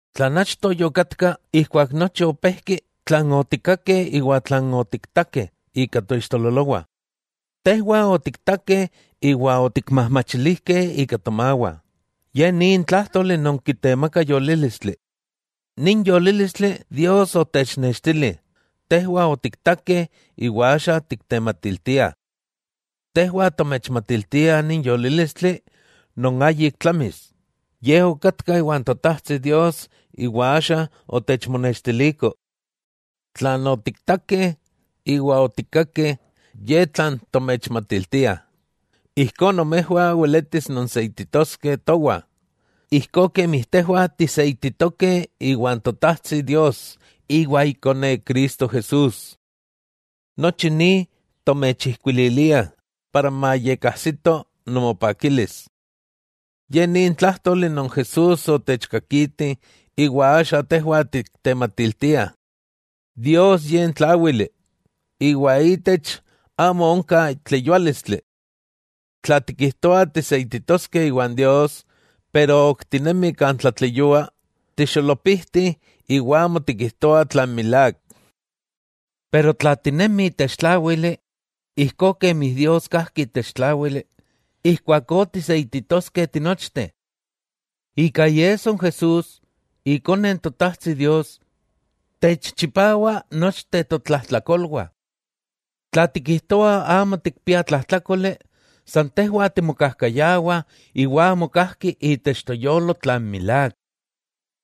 Tlan achto yokatka, ijkuak nochi opejki, tlan otikkakeh iwa tlan otiktakeh ika toixtololowah, tejwah otiktakeh iwa otikmajmachilijkeh ika tomawah, ye nin tlájtoli non kitemaka yolílistli. Nin yolílistli Dios otechnextili, tejwah otiktakeh iwa axa tiktematiltiah. Tejwah tomechmatiltiah nin yolílistli non ayik tlamis, Ye okatka iwan Totajtsi Dios iwa axa otechmonextiliko. Tlan otiktakeh iwa otikkakeh ye tlan tomechmatiltiah, ijkó nomejwah weletis nonseititoskeh towah, ijkó kemi tejwah tiseititokeh iwan Totajtsi Dios iwa Ikone Cristo Jesús. Nochi ni tomechijkuililiah para mayekajsito nomopakilis. Ye ni n tlájtoli non Jesús otechkakiti iwa axa tejwah tiktematiltiah: Dios Ye n Tláwili, iwa ítech, amo onka tleyuálistli. Tla tikijtoah tiseititoskeh iwan Dios, pero ok tinemih kan tlatleyua, tixolopijti iwa amo tikijtoah tlan milák. Pero tla tinemih itech tláwili, ijkó kemi Dios kajki itech tláwili, ijkuakó tiseititokeh tinochteh. Ika iesso n Jesús, Ikone n Totajtsi Dios, techchipawa nochteh totlajtlakolwah. Tla tikijtoah amo tikpiah tlajtlákoli, san tejwah timokajkayawah iwa amo kajki itech toyolo tlan milák.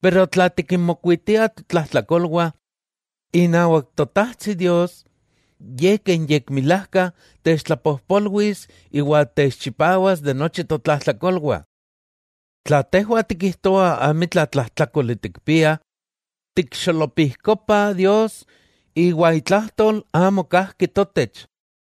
Pero tla tikinmokuitiah totlajtlakolwah, inawak Totajtsi Dios, Ye ke n yekmilajka, techtlapojpolwis iwa techchipawas de nochi totlajtlakolwah. Tla tejwah tikijtoah amitla tlajtlákoli tikpiah, tikxolopijkopah Dios, iwa itlajtol amo kajki totech.